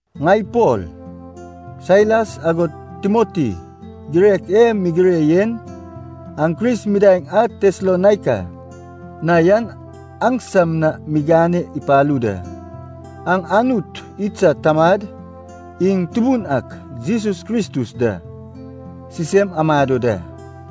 Ŋai Pol, Sailas agod Timoti, girek e migire yen aŋ Kris midaeŋ a Tesalonaika na yan aŋsam na migane ipalu da. Aŋ Anut idsad Tamad iŋ Tubun ak Jesus Kristus da, sisem amado da.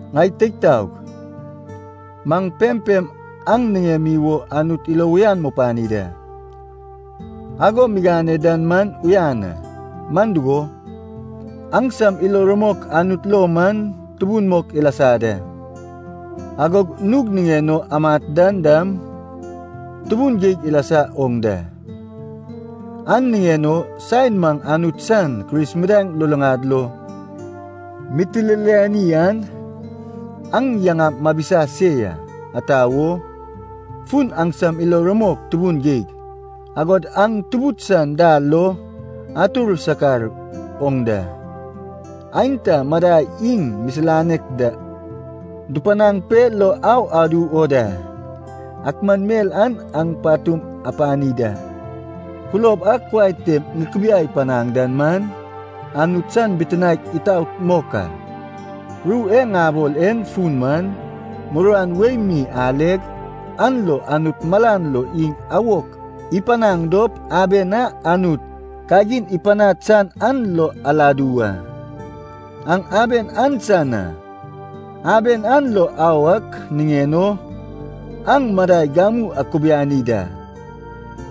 Ŋai teig taog, maŋ pempem aŋ niŋemi wo Anut ilo uyan mupani da. Ago migane dan man uyan a, man dugo, aŋsam ilo rumok Anut lo man tubun mok ilasa da. Agog nug niŋen o amat dan dam tubun geig ilasa oŋ da. An niŋen o saen maŋ Anut san Kris midaeŋ luluŋad lo mitililani an, aŋ yaŋam mabisa se ya. Ata wo? Fun aŋsam ilo rumok tubun geig, agod aŋ Tubud san dal lo atur sakar oŋ da. Aenta madai iŋ misilanek da dupanaŋ pe lo au adu o da, ak man mel an aŋ patum apani da. Kulob a kuai tem ikibiai panad dan man, Anut san bitinaek itaot mok a. Ru e ŋabol en fun man, muruan wei mi aleg, an lo Anut malan lo iŋ awok ipanaŋ dop, aben a Anut kagin ipanad san an lo aladu wa. Aŋ aben an san a, aben an lo au ak niŋen o aŋ madai gamu akubiani da.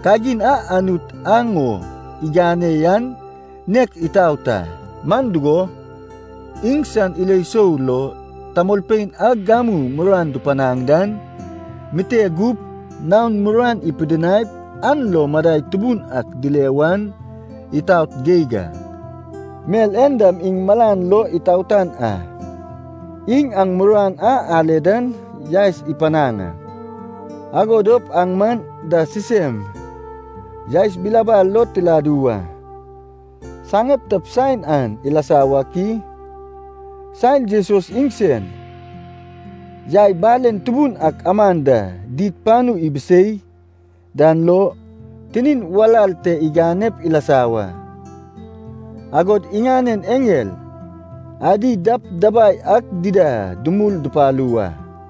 Kagin a Anut aŋ o igane yan nek itaot a. Man dugo, iŋsan ilo sou lo tamolpein a gamu muruan dupanaŋ dan mite gup naon muruan ipidinaip, an lo madai tubun ak dile wan itaot geig a. Mel en dam iŋ malan lo itaotan a. Iŋ aŋ muruan a ale dan yaes ipanaŋ a, ago dop aŋ maŋ da sisem yaes bilabal lo tiladu wa. Saŋeptap saen an ilasa wak i? Saen Jesus iŋsen yai balen tubun ak aman da did panu ibisei dan lo, tinin walal te iganep ilasa wa, agod iŋanen eŋel adi dabdabai ak dida dumul dupalu wa.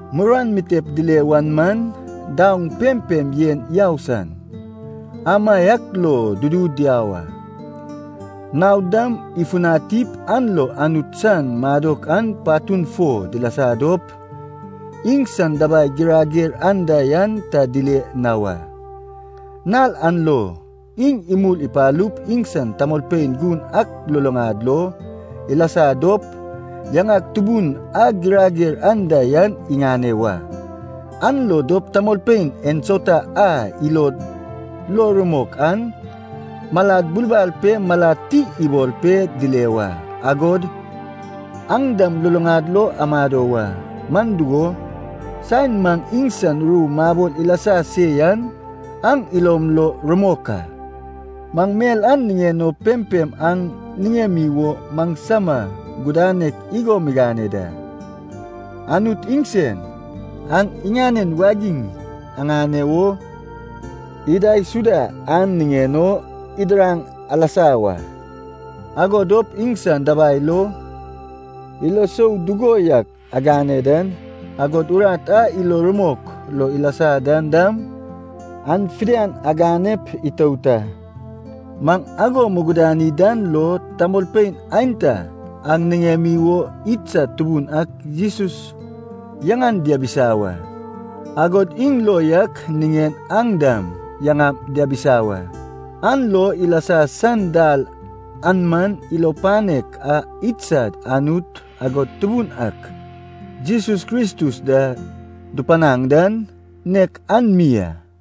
Muruan mitep dile wan man, daoŋ pempem yen yau san, amaiak lo dudu diau a. Naod dam ifutanip an lo Anut san madok an patun fo dilasa dop, iŋsan dabai girager anda yan ta dile na wa. Nal an lo, iŋ imul ipalup iŋsan tamolpein gun ak luluŋad lo ilasa dop, yaŋak tubun a girager anda yan iŋane wa. An lo dop, tamolpein ensauta a ilod lo rumok an malad bulbal pe malad ti ibol pe dile wa. Agod aŋ dam luluŋad lo amado wa. Man dugo, saen maŋ iŋsan ru mabol ilasa se yan aŋ ilom lo rumok a. Maŋ mel an niŋen o pempem aŋ niŋemi wo maŋsama gudanek igo migane da. Anut iŋsen, aŋ iŋanen wagiŋ aŋane wo idaisuda an niŋen o idiraŋ alasa wa. Ago dop iŋsan dabai lo, ilo isou dugo yak agane dan, agod urat a ilo rumok lo ilasa dan dam, an fidian aganep itout a. Maŋ ago mugudani dan lo tamolpein aenta aŋ niŋemi wo idsad Tubun ak Jesus yaŋan diabisa wa, agod iŋ lo yak niŋen aŋ dam yaŋam diabisa wa. An lo ilasa san dal an man ilo panek a idsad Anut agod Tubun ak Jesus Kristus da dupanaŋ dan, nek an mi a.